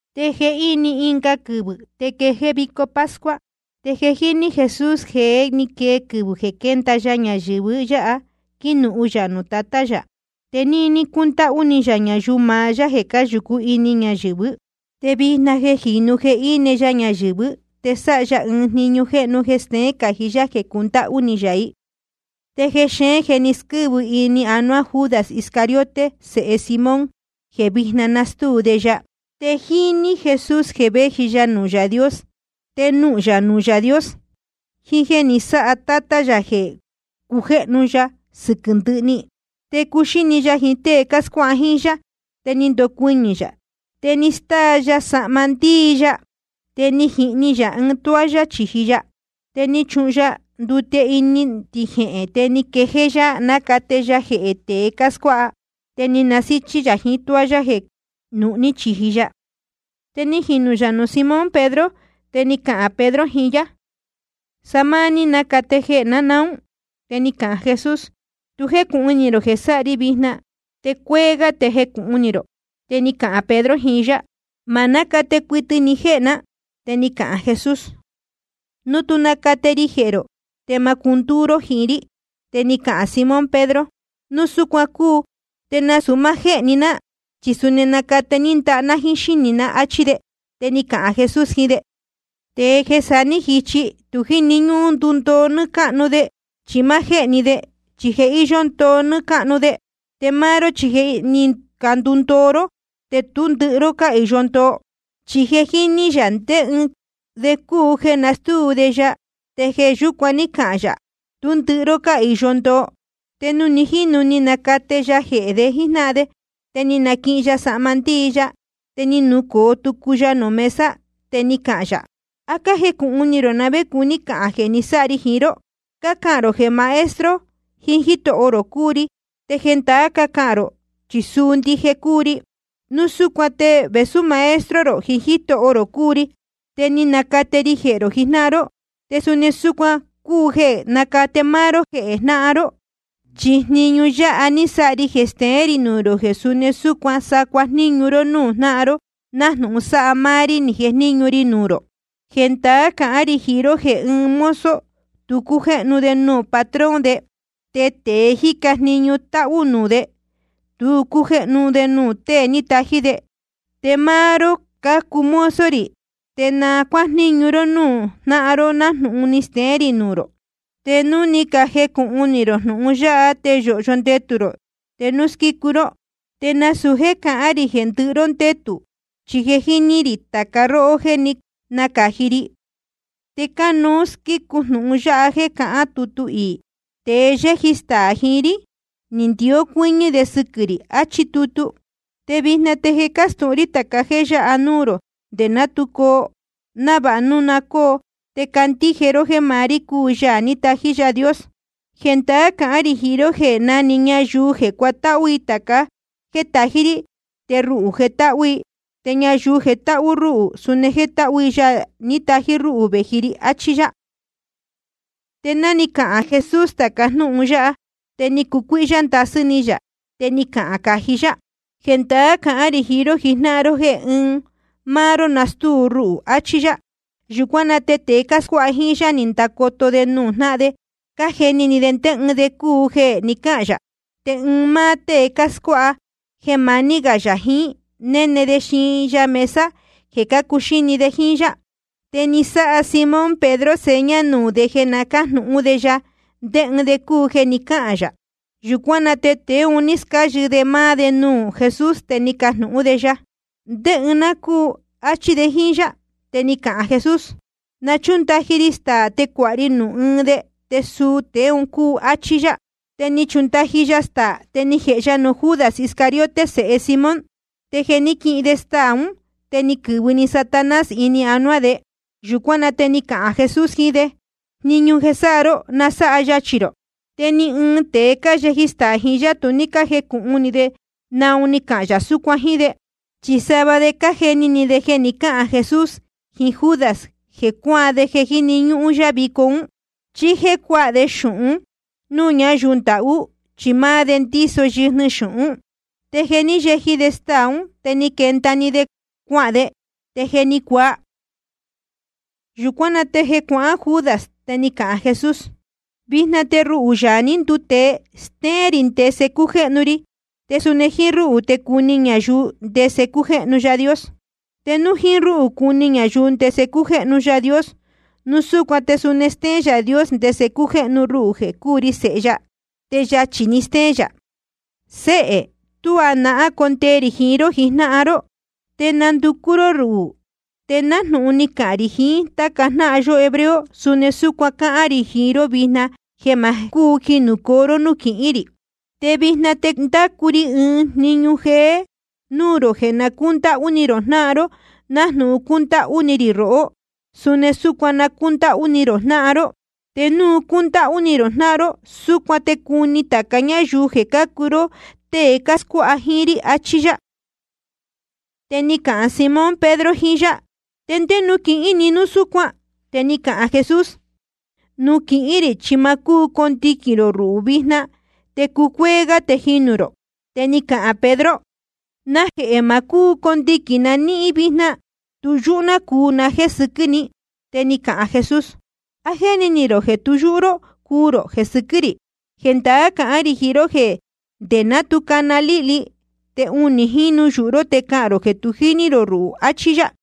Te jehíni ɨnga quɨvɨ̄ te quejéé vico pascua. Te je jíní Jesús jeē ní quee quɨvɨ̄ jeē quénda ya ñayɨ̄vɨ yáha quínuhun yā nuū Tatá yā. Te níní cúndáhú ni yā ñayuu maá yá jeē cáyūcú ini ñayɨ̄vɨ́. Te vijna jeē jínu jeē íne ya ñayɨ̄vɨ́, te sáha ya ɨɨn jniñu jeē steén cají yá jeē cundáhú ni yā i. Te jexeén je ni squɨ́vɨ ini anuá Judas Iscariote sēhe Simón, jeē vijna nastúu de ya. Te jíní Jesús jeē véji ya nuū Yaā Dios, te nuhūn yā nuū Yaā Dios, jiín jéē ni sáha Tátá yā jeē cujéhnu ya sɨquɨ̄ ndɨhɨ‑ni. Te cúxíni ya jiín tée cáscuáha jíín yá, te ni ndocuɨñɨ̄ yā. Te ni stáa ya sahma ndíi ya, te ni jihni yā ɨɨn toalla chīji ya. Te ni chuhun ya ndute ini ɨɨn tijehēn. Te ni quejéé yá nácate ya jehē tēe cáscuáha. Te násíchí yā jiín toalla jeē nuhní chīji ya. Te ni jinū yā nuū Simón Pedro. Te ni cahān Pedro jiín yá: ¿Sa máá ní nacate jehē ná naún? Te ni cahān Jesús: Tu jécūhun ni rō jeē sáha ri vijna, te cúcuéé gá te jecūhun ni rō. Te ni cahān Pedro jiín yá: Ma nácate cuɨtɨ ni jéhē ná. Te ni cahān Jesús: Núu tú nacate ri jehē rō, te ma cúu cundúú ró jiín rí. Te ni cahān Simón Pedro: Núu súcuan cúu te nasūu máá jéhē‑ni ná, chi suni nacate ní ndaha ná jíín xínī ná, áchí de. Te ni cahān Jesús jiín de: Tēe jeē sa ní jichi, tu jíni ñúhún ndundoo nɨ́ɨ́ cáhnu de, chi máá jéhē‑ni de, chi je íyó ndoo nɨ́ɨ́ cáhnu de. Te máá ró chi je ni candundoo ró. Te tú ndɨhɨ ró cáhīyo ndoo. Chi je jíní yā ndé ɨɨn de cúu jeē nastúu de ya, te jeē yúcuan ní cahān yā: Tú ndɨhɨ ró cáhīyo ndoo. Te nuū ni jínu ni nacate ya jehē de jíjnáhan de, te ni naquihin ya sahma ndíi ya, te ni nucōo tucu ya nuū mesa. Te ni cahān yā: ¿A cájecūhun ni rō na vé cuní cahān jeē ni sáha ri jiín ró? Cácahān rō jeē Maestro jiín Jítoho rō cúu ri, te ndaā cácahān rō, chi suu ndije cúu ri. Núu súcuan te vēsú Maestro rō jiín Jítoho rō cúu ri, te ni nacate ri jehē rō jijnáhan ró, te suni súcuan cánuú jéē nacate máá ró jehē jnáhan ró. Chi jniñu yáha ni sáha ri jeē steén rī nuū rō jeē suni súcuan sa cuajníñu ró núū jnáhan ró, nájnūhun sa máá rí ni jejníñu ri nuū rō. Jendaá cahán rī jiín ró jeē ɨɨn mozo tu cújéhnu de nuū patrón de, te tēe jíca jniñu táhú nuū de, te cújéhnu de nuū tée ni tají de. Te máá ró cácuu mozo rī, te na cuájníñu ró núū jnáhan ró nájnūhun ni steén rī nuū rō. Te núu ni cajecūhun ni rō jnūhun yáha, te yōhyo ndetū rō te núu squícu ró. ’Te nasūu jéē cahán rī jeē ndɨhɨ ró ndétū, chi je jíní rī tāca róhó jéē ní nacāji ri. Te cánuú squícu jnūhun yáha jeē cáhán tutu iī: Tēe yéji staā jiín rí, ni ndió cuɨ́ñɨ́ de sɨquɨ̄ rī, achí tutu. Te vijna te je cástūhun rí tāca jéē yáha núū rō nde ná tu coo, návāha núu na cóo, te candíje ró jéē maá rí cúu Yaā ní tají Yaā Dios. Jendaá cahán rī jiín ró jeē na‑ni ñayuu jeē cuatáhú i tāca jéē tají rí, te ruhū jetáhú i. Te ñayuu jetáhú rúhū, suni jétáhú i Yaā ní tají rúhū vēji ri, achí yá. Te ná ni cahān Jesús tāca jnúhun yáha, te ni cucuíhyá ndasɨ́ ni yā. Te ni cahān cají yá: Jendaá cahán rī jiín ró jijnáhan ró jéē ɨɨn máá ró nastúu ruhū, achí yá. Yūcuán na te tēe cáscuáha jíín yá, ni candacoto de nuū jnáhan de, cájeni ni de ndé ɨɨn de cúu jeē ni cáhān yā. Te ɨɨn máá tée scuáha jeē maní gā yā jiín, néne de xiin ya mesa jeē cácuxíni de jíín yá. Te ni sáha Simón Pedro seña nuū de jeē na cájnūhún de ya ndé ɨɨn de cúu jeē ni cáhān yā. Yūcuán na te tēe un ní scáyɨ de máá de nuū Jesús, te ni cajnūhún de ya: ¿Ndé ɨɨn de cúu? áchí de jíín yá. Te ni cahān Jesús: Na chúndaji ri staā te cuāha ri nuū ɨɨn de, te suu tēe un cúu, áchí yá. Te ni chundaji ya staā, te ni jēhe ya nuū Judas Iscariote sēhe Simón. Te jeē ní quihin de staā ún, te ni quɨ̄vɨ‑ni Satanás ini anuá de. Yūcuán na te ni cahān Jesús jiín de: Jniñu jeē sáha ró, na sáha yachī rō. Te ni ɨɨn tēe cáyeji staā jiín yá, tu ní cájecūhun ni de naun ni cahān yā súcuan jíín de. Chi sava de cájeni ni de jeē ni cáhān Jesús jiín Judas jeē cuáan de jeē jíni ñúhún yá vico ún, chí jéē cuáha de jecu xūhun núū ñayuu ndahú. Chi máá de ndíso yɨjnɨ xūhún. Te jeē ní yeji de staā ún, te ni quenda‑ni de cuahān de. Te je ni cuaa. Yūcuán na te jeē cuahán Judas te ni cahān Jesús: Vijna te ruhū, Yaā ní nduu tēe, stéén rī ndese cújéhnu ri, te suni jíín rúhū te cuni ñayuu ndese cújéhnu Yaā Dios. Te núu jíín rúhū cuni ñayuu ndese cújéhnu Yaā Dios, núu súcuan te suni stéén Yaā Dios ndese cújéhnu ruhū jeē cúu ri Sēhe ya. Te yachī‑ni stéén yā. Séhē, tuá nahán condee rī jiín ró jijnáhan ró. Te nanducú ró ruhū, te nájnūhun ni cahān rī jiín táca jnáhan yó hebreo, suni súcuan cáhán rī jiín ró vijna, jeē ma cúu jinūcoo ró núū quihín rī. Te vijna te ndácu ri ɨɨn jniñu jéé núū rō, jeē na cúndáhú ni rō jnáhan ró. Nájnūhun cúndáhú ni rī rohó, suni súcuan na cúndáhú ni rō jnáhan ró. Te núu cúndáhú ni rō jnáhan ró, súcuan te cuni tāca ñáyuu jeē cácuu ró tée cáscuáha jíín rí, achí yá. Te ni cahān Simón Pedro jiín yá: ¿Ndé nuū quihín ni núu súcuan? Te ni cahān Jesús: Nuū quihín rī chi ma cúu condiquīn rō ruhū vijna, te cúcuéé gá te jinū rō. Te ni cahān Pedro: ¿Najehē ma cúu condiquīn na níhín vijna? Tu yúhú ná cuu na jéē sɨquɨ́ ni. Te ni cahān Jesús: ¿A jéni ni rō jeē tu yúhú ró cuu rō jeē sɨquɨ́ rī? Jendaá cahán rī jiín ró jeē nde ná tu cana líhli, te unī jínu yūhu ró te cahān rō jeē tu jíní rō ruhū. Achí yá.